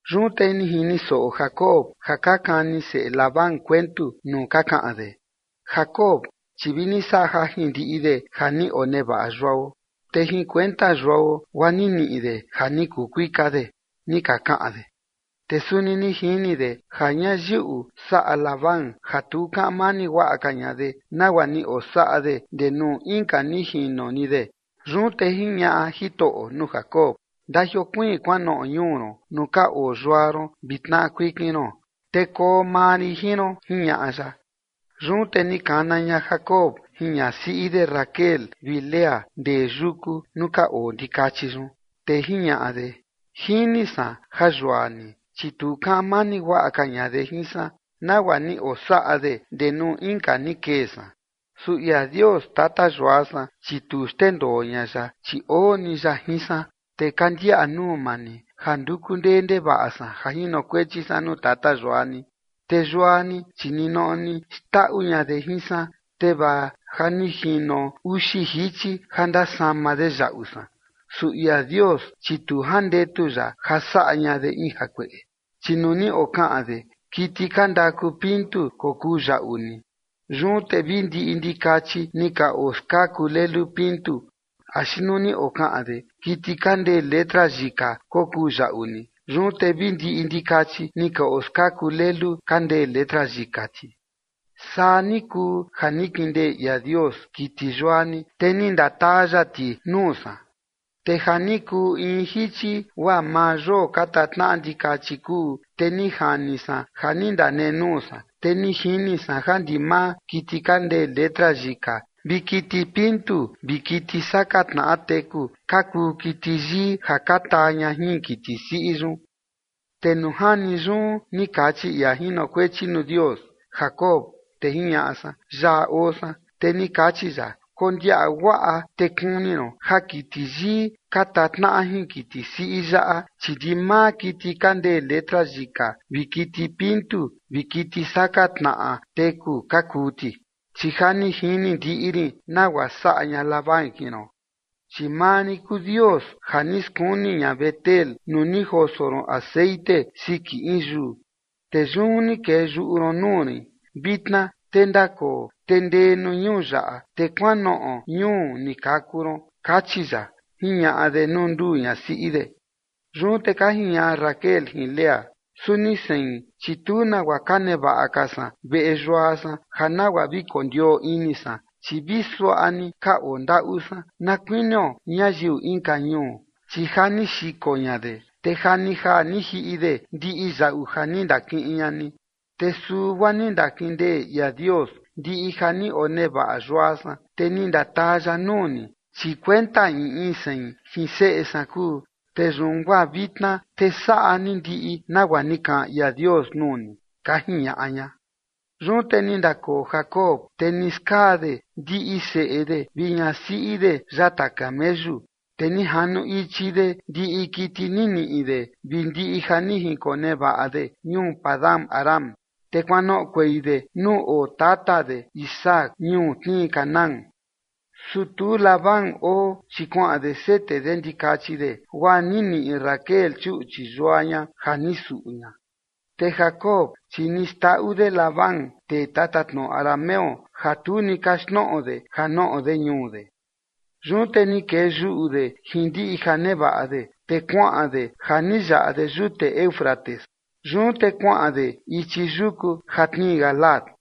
Yun te ni jini soꞌo Jacob ja ka kani seꞌe Labán kuentu nuu ka kaꞌan de: ―Jacob, chi vi ni saꞌa jajin ndiꞌi de ja ni onevaꞌa yuao, te jin kuenta yuao guaa ni niꞌi de ja ni kuu kuika de ―ni ka kaꞌan de. Te suni ni jini de ja ñayiꞌu saꞌa Labán ja tu kaꞌan mani guaꞌa ka ña de, nagua ni osaꞌa de ndee nuu inka ni jino ni de. Yun te jiñaꞌa Jitoꞌo nuu Jacob: ―Ndajiokuiin kuanoꞌo ñuu ron nuu ka oo yua ron vi tnaꞌa kuikin ron, te koo maa rin jin ron ―jiñaꞌa ya. Yun te ni kana ña Jacob jin ñasiꞌi de Raquel vi Lea ndee yuku nuu ka oo ndikachi yun. Te jiñaꞌa de: ―Jini san ja yua ni, chi tu kaꞌan mani guaꞌa ka ña de jin san, nagua ni osaꞌa de ndee nuu inka ni kee san. Su ia Dios, tata yua san, chi tu xndendoo ña ya, chi oo ni ya jin san. Te ka ndiaꞌa nuu maa ni ja nduku ndee ndevaꞌa san ja jinokuechi san nuu tata yua ni. Te yua ni, chi ninoꞌo ni xndaꞌu ña de jin san, te vaa ja ni jino uxi jichi ja ndasama de yaꞌu san. Su ia Dios, chi tu jandetu ya ja saꞌa ña de in jakueꞌe. Chi nuu ni okaꞌan de: “Kiti ka ndaku pintu kokuu yaꞌu ni”, yun te vi ndiꞌi ndikachi ni ka oskaku lelu pintu. Axi nuu ni okaꞌan de: “Kiti kaa ndee letra yika kokuu yaꞌu ni”, yun te vi ndiꞌi ndikachi ni ka oskaku lelu ka ndee letra yika ti. Saa ni kuu ja ni kindee ia Dios kiti yua ni, te ni ndataa ya ti nuu san. Te ja ni kuu in jichi guaa maa yoo ka tatnaꞌa ndikachi kuu, te ni jani san ja ni ndanenuu san, te ni jini san ja ndimaa kiti ka ndee letra yika vi kiti pintu vi kiti saka tnaꞌa teku ka kuu kiti yii ja ka taa ña jin kiti siꞌi yun. Te nuu jani yun ni kachi ia jinokuechi nuu Dios: “Jacob”. Te jiñaꞌa san: “Yaꞌa oo san”. Te ni kachi ya: “Kondiaꞌa guaꞌa te kuni ron ja kiti yii ka tatnaꞌa jin kiti siꞌi yaꞌa, chi ndimaa kiti ka ndee letra yika vi kiti pintu vi kiti saka tnaꞌa teku ka kuu ti, chi ja ni jini ndiꞌi rin nagua saꞌa ña Labán jin ron. Chi maa rin kuu Dios ja ni skuni ña Betel nuu ni joso ron texeꞌen siki in yuu, te yun ni kee yuꞌu ron nuu rin. Vitna te ndakoo, te ndee nuu ñuu yaꞌa, te kuanoꞌo ñuu ni kaku ron”, kachi ya ―jiñaꞌa de nuu nduu ñasiꞌi de. Yun te ka jiñaꞌa Raquel jin Lea: ―Suni sein, chi tu nagua ka nevaꞌa ka san veꞌe yua san ja nagua vi kondioo ini san. Chi vi suaꞌa ni ka ondaꞌu san na kuinio ñayiu inka ñuu, chi ja ni xiko ña de, te ja ni jaa ni jiꞌi de ndiꞌi yaꞌu ja ni ndakiꞌin ña ni. Te su guaa ni ndakindee ia Dios ndiꞌi ja ni onevaꞌa yua san, te ni ndataa ya nuu ni, chi kuenta in in sein jin seꞌe san kuu. Te yun guaa vitna te saꞌa ni ndiꞌi nagua ni kaꞌan ia Dios nuu ni ―ka jiñaꞌa ña. Yun te ni ndakoo Jacob, te ni skaa de ndiꞌi seꞌe de vi ñasiꞌi de yata kameyu. Te ni janu ichi de ndiꞌi kiti ni niꞌi de vi ndiꞌi ja ni jinkonevaꞌa de ñuu Padan-aram, te kuanoꞌokuei de nuu oo tata de Isaac ñuu tnii Canaán. Su tu Labán oo, chi kuaꞌan de sete de ndikachi de, guaa ni niꞌi Raquel chuꞌchi yua ña ja ni suꞌu ña. Te Jacob, chi ni xndaꞌu de Labán, tee tatatnoꞌo arameo, ja tu ni kaxtnoꞌo de ja noꞌo de ñuu de. Yun te ni kee yuꞌu de jin ndiꞌi ja nevaꞌa de, te kuaꞌan de ja ni yaꞌa de yute Éufrates, yun te kuaꞌan de ichi yuku ja tnii Galaad.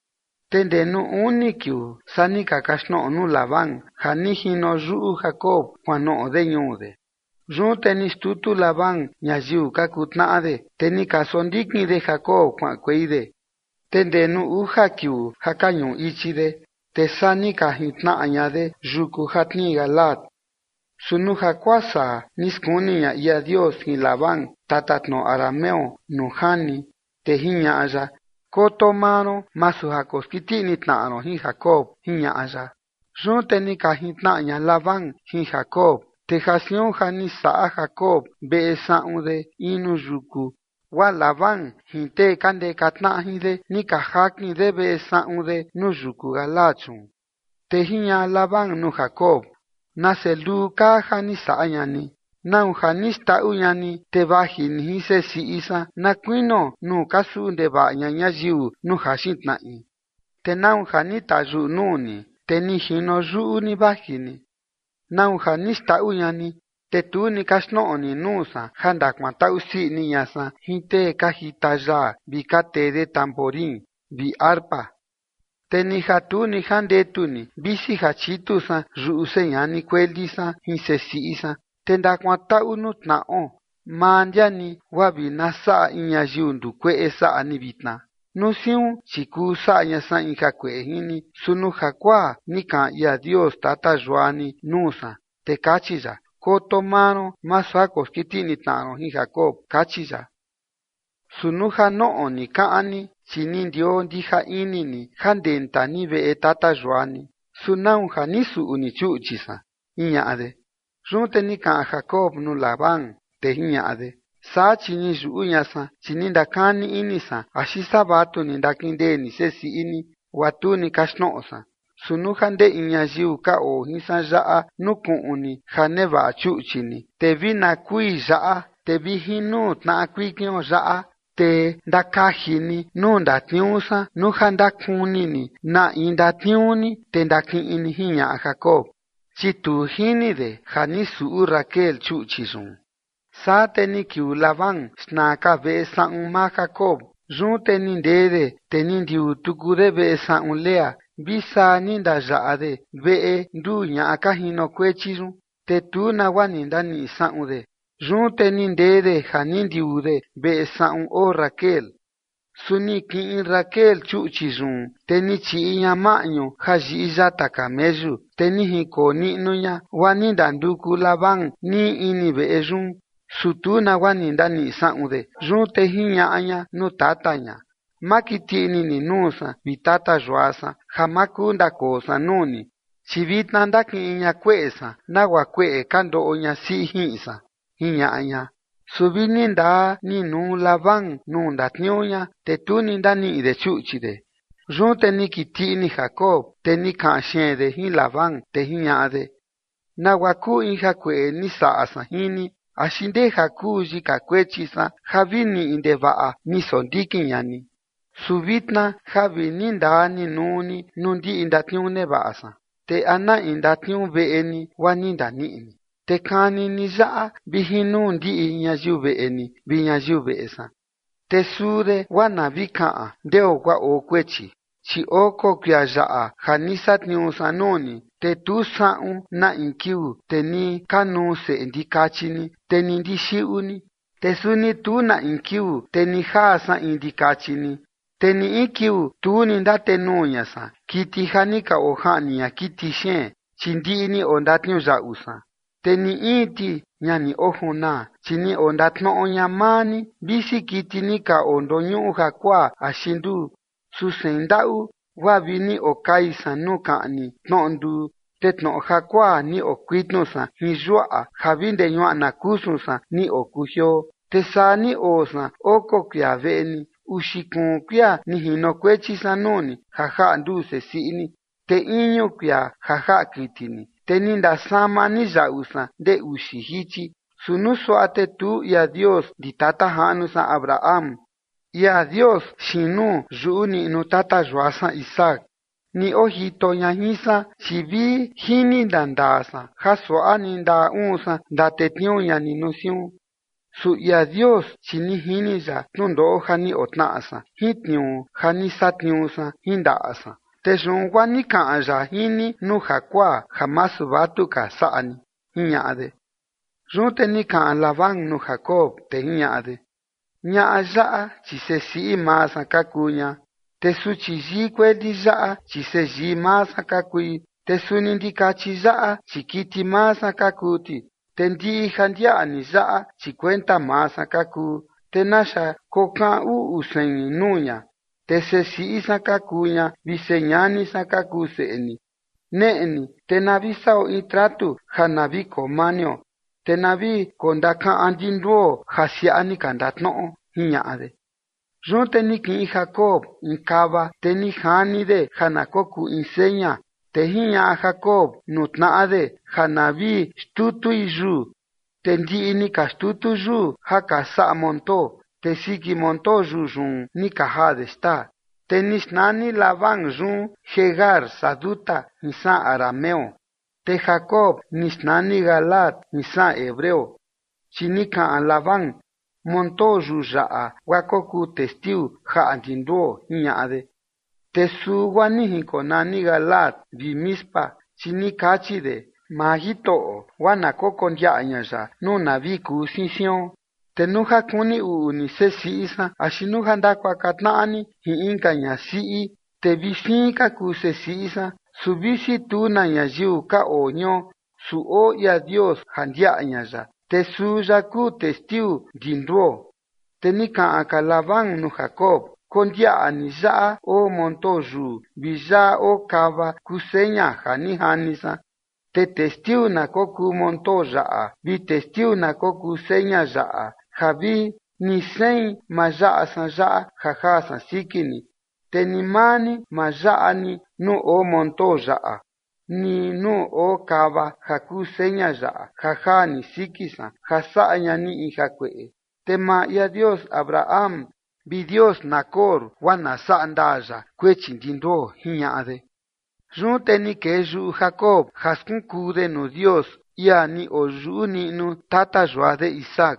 Te ndee nuu uni kiuu saa ni ka kaxtnoꞌo nuu Labán ja ni jino yuꞌu Jacob kuanoꞌo de ñuu de. Yun te ni xtutu Labán ñayiu ka kuu tnaꞌa de, te ni ka sondikin de Jacob kuaꞌankuei de, te ndee nuu uja kiuu ja ka ñuꞌu ichi de, te saa ni ka jintnaꞌa ña de yuku ja tnii Galaad. Su nuu jakuaa saa ni skuni ña ia Dios jin Labán, tatatnoꞌo arameo, nuu jani, te jiñaꞌa ya: ―Koto maa ron masu ja koskiti ini tnaꞌa ron jin Jacob ―jiñaꞌa ya. Yun te ni ka jintnaꞌa ña Labán jin Jacob. Te ja siun ja ni saꞌa Jacob veꞌe saꞌun de in nuu yuku, guaa Labán jin tee ka ndeka tnaꞌa jin de ni ka jakin de veꞌe saꞌun de nuu yuku Galaad yun. Te jiñaꞌa Labán nuu Jacob: ―¡Nase luu kaa ja ni saꞌa ña ni! ¿Nau ja ni xndaꞌu ña ni, te vaji ni jin sesiꞌi san na kuinio nuu ka suꞌu ndevaꞌa ña ñayiu nuu jaxin tnaꞌi? ¿Te nau ja ni tayuꞌu nuu ni, te ni jino yuꞌu ni vaji ni? ¿Nau ja ni xndaꞌu ña ni, te tu ni kaxtnoꞌo ni nuu san ja ndakuantaꞌu sii ini ña san jin tee ka jita yaa vi ka tee de tamborín vi arpa? Te ni ja tu ni jandetu ni visi ja chitu san yuꞌu seꞌe ñani kueli san jin sesiꞌi san, te ndakuantaꞌu nuu tnaꞌo. Maa ndia ni, guaa vi na saꞌa in ñayiu ndukueꞌe saꞌa ni vitna. Nuu siun chi kuu saꞌa ña san in jakueꞌe jin ni, su nuu jakuaa ni kaꞌan ia Dios tata yua ni nuu san, te kachi ya: “Koto maa ron masu ja koskiti ini tnaꞌa ron jin Jacob” kachi ya. Su nuu ja noꞌo ni kaꞌan ni, chi ni ndioo ndija ini ni ja ndenta ni veꞌe tata yua ni, ¿su nau ja ni suꞌu ni chuꞌchi san? ―jiñaꞌa de. Yun te ni kaꞌan Jacob nuu Labán, te jiñaꞌa de: ―Saa chi ni yuꞌu ña san, chi ni ndakani ini san axi saa vatu ni ndakindee ni sesiꞌi ni guaa tu ni kaxtnoꞌo san. Su nuu ja ndee in ñayiu ka oo jin san yaꞌa nukuꞌun ni ja nevaꞌa chuꞌchi ni, te vi na kui yaꞌa. Te vi jin nuu tnaꞌa kuikion yaꞌa, te ndakaji ni nuu ndatniuu san nuu ja ndakuni ni na in ndatniuu ni, te ndakiꞌin ni ―jiñaꞌa Jacob, chi tu jini de ja ni suꞌu Raquel chuꞌchi yun. Saa te ni kiuu Labán xna ka veꞌe saꞌun maa Jacob. Yun te ni ndee de, te ni ndiuu tuku de veꞌe saꞌun Lea vi saa ni ndayaꞌa de veꞌe nduu ñaꞌa ka jinokuechi yun, te tu nagua ni ndaniꞌi saꞌun de. Yun te ni ndee de ja ni ndiuu de veꞌe saꞌun oo Raquel. Su ni kiꞌin Raquel chuꞌchi yun, te ni chiꞌi ña maꞌñu ja yiꞌi yata kameyu, te ni jinkoo niꞌnu ña. Guaa ni ndanduku Labán nii ini veꞌe yun, su tu nagua ni ndaniꞌi saꞌun de. Yun te jiñaꞌa ña nuu tata ña: ―Ma kiti ini ni nuu san, vi tata yua san, ja ma kuu ndakoo san nuu ni, chi vitna ndakiꞌin ña kueꞌe san, nagua kueꞌe ka ndoꞌo ñasiꞌi jiꞌin san ―jiñaꞌa ña. Su vi ni ndaa ni nuu Labán nuu ndatniuu ña, te tu ni ndaniꞌi de chuꞌchi de. Yun te ni kiti ini Jacob, te ni kaꞌan xeen de jin Labán, te jiñaꞌa de: ―¿Nagua kuu in jakueꞌe ni saꞌa san jin ni? ¿Axi ndeja kuu yika kuechi san ja vi niꞌi ndevaꞌa ni sondikin ña ni? Su vitna ja vi nii ndaa nii nuu ni nuu ndiꞌi ndatniuu nevaꞌa san, ¿te a na in ndatniuu veꞌe ni guaa ni ndaniꞌi ni? Te kani ni yaꞌa vi jin nuu ndiꞌi ñayiu veꞌe ni vi ñayiu veꞌe san, te suu de guaa na vi kaꞌan ndeo guaa oo kuechi. Chi oko kuia yaꞌa ja ni satniuu san nuu ni, te tu saꞌun na in kiuu, te ni kanuu seꞌe ndikachi ni, te ni ndixiꞌu ni, te suni tu na in kiuu te ni jaa san in ndikachi ni. Te ni in kiuu tu ni ndatenuu ña san kiti ja ni ka ojaꞌni ña kiti xeen, chi ndiꞌi ni ondatniuyaꞌu san. Te ni in ti ña ni ojunaa, chi ni ondatnoꞌo ña maa ni visi kiti ni ka ondoñuꞌu jakuaa axi nduu. Su sein ndaꞌu guaa vi ni okai san nuu kaꞌni tnoꞌo nduu, te tnoꞌo jakuaa ni okuitnu san jin yuaꞌa ja vi ndee ñuaꞌna kusun san ni okujioo. Te saa ni oo san oko kuia veꞌe ni. Uxi kuun kuia ni jinokuechi san nuu ni ja jaꞌa nduu sesiꞌi ni, te iñu kuia ja jaꞌa kiti ni, te ni ndasama ni yaꞌu san ndee uxi jichi. Su nuu suaꞌa te tu ia Dios ndi tata jaꞌnu san Abraham, ia Dios xiin nuu yuꞌu niꞌnu tata yua san Isaac ni ojito ña jin san, chi vi jini ndandaa san ja suaꞌa ni ndaꞌa uun san ndatetniuu ña ni nuu siun. Su ia Dios, chi ni jini ya tnundoꞌo ja ni otnaꞌa san jin tniuu ja ni satniuu san jin ndaꞌa san, te yun guaa ni kaꞌan ya jin ni nuu jakuaa ja masu vatu ka saꞌa ni ―jiñaꞌa de. Yun te ni kaꞌan Labán nuu Jacob, te jiñaꞌa de: ―Ñaꞌa yaꞌa, chi sesiꞌi maa san ka kuu ña, te suchi yii kueli yaꞌa, chi seyii maa san ka kui, te suni ndikachi yaꞌa, chi kiti maa san ka kuu ti, te ndiꞌi ja ndiaꞌa ni yaꞌa, chi kuenta maa san ka kuu. Te naxa kokaꞌan uꞌu sein nuu ña, te sesiꞌi san ka kuu ña vi señani san ka kuu seꞌe ni. Neꞌe ni te na vi saꞌo in tratu ja na vi koo manio, te na vi kondakaꞌan ndi nduo ja siaꞌa ni ka ndatnoꞌo ―jiñaꞌa de. Yun te ni kiꞌin Jacob in kava, te ni jani de ja na kokuu in seña. Te jiñaꞌa Jacob nuu tnaꞌa de ja na vi xtutui yuu. Te ndiꞌi ni ka xtutu yuu ja ka saꞌa montoo, te siki montoo yuu yun ni ka jaa de xtaa. Te ni xnani Labán yun Jegar Sahaduta jin saꞌan arameo. Te Jacob ni xnani Galaad jin saꞌan hebreo. Chi ni kaꞌan Labán: ―Montoo yuu yaꞌa guaa kokuu testiu jaꞌa ndi nduo ―jiñaꞌa de. Te su guaa ni jinkonani Galaad, vi Mispa, chi ni kachi de: ―Maa Jitoꞌo guaa na kokondiaꞌa ña ya nuu na vi kuu siin sion. Te nuu ja kuni uꞌu ni sesiꞌi san axi nuu ja ndakuaka tnaꞌa ni jin inka ñasiꞌi, te vi siin ka kuu sesiꞌi san, su visi tu na ñayiu ka oo jion, su oo ia Dios ja ndiaꞌa ña ya, te suu ya kuu testiu ndi nduo. Te ni kaꞌan ka Labán nuu Jacob: ―Kondiaꞌa ni yaꞌa oo montoo yuu vi yaꞌa oo kava kuu seña ja ni jani san. Te testiu na kokuu montoo yaꞌa vi testiu na kokuu seña yaꞌa ja vi ni sein ma yaꞌa san yaꞌa ja jaa san siki ni, te ni maa ni ma yaꞌa ni nuu oo montoo yaꞌa ni nuu oo kava ja kuu seña yaꞌa ja jaa ni siki san ja saꞌa ña ni in jakueꞌe. Te maa ia Dios Abraham vi Dios Nacor guaa na saꞌa ndaa ya kuechi ndi nduo ―jiñaꞌa de. Yun te ni kee yuꞌu Jacob ja skunkuu de nuu Dios, ia ni oyuꞌu niꞌnu tata yua de Isaac.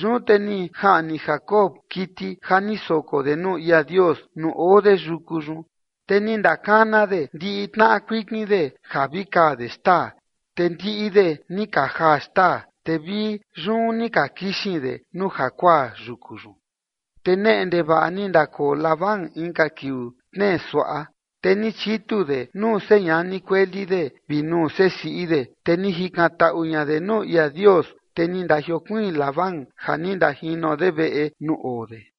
Yun te ni jaꞌni Jacob kiti ja ni soko de nuu ia Dios nuu oo de yuku yun, te ni ndakana de ndiꞌi tnaꞌa kuikin de ja vi kaa de xtaa. Te ndiꞌi de ni ka jaa xtaa, te vi yun ni ka kixin de nuu jakuaa yuku yun. Te neꞌe ndevaꞌa ni ndakoo Labán inka kiuu tnee suaꞌa, te ni chitu de nuu señani kueli de vi nuu sesiꞌi de, te ni jikantaꞌu ña de nuu ia Dios. Te ni ndajiokuiin Labán ja ni ndajino de veꞌe nuu oo de.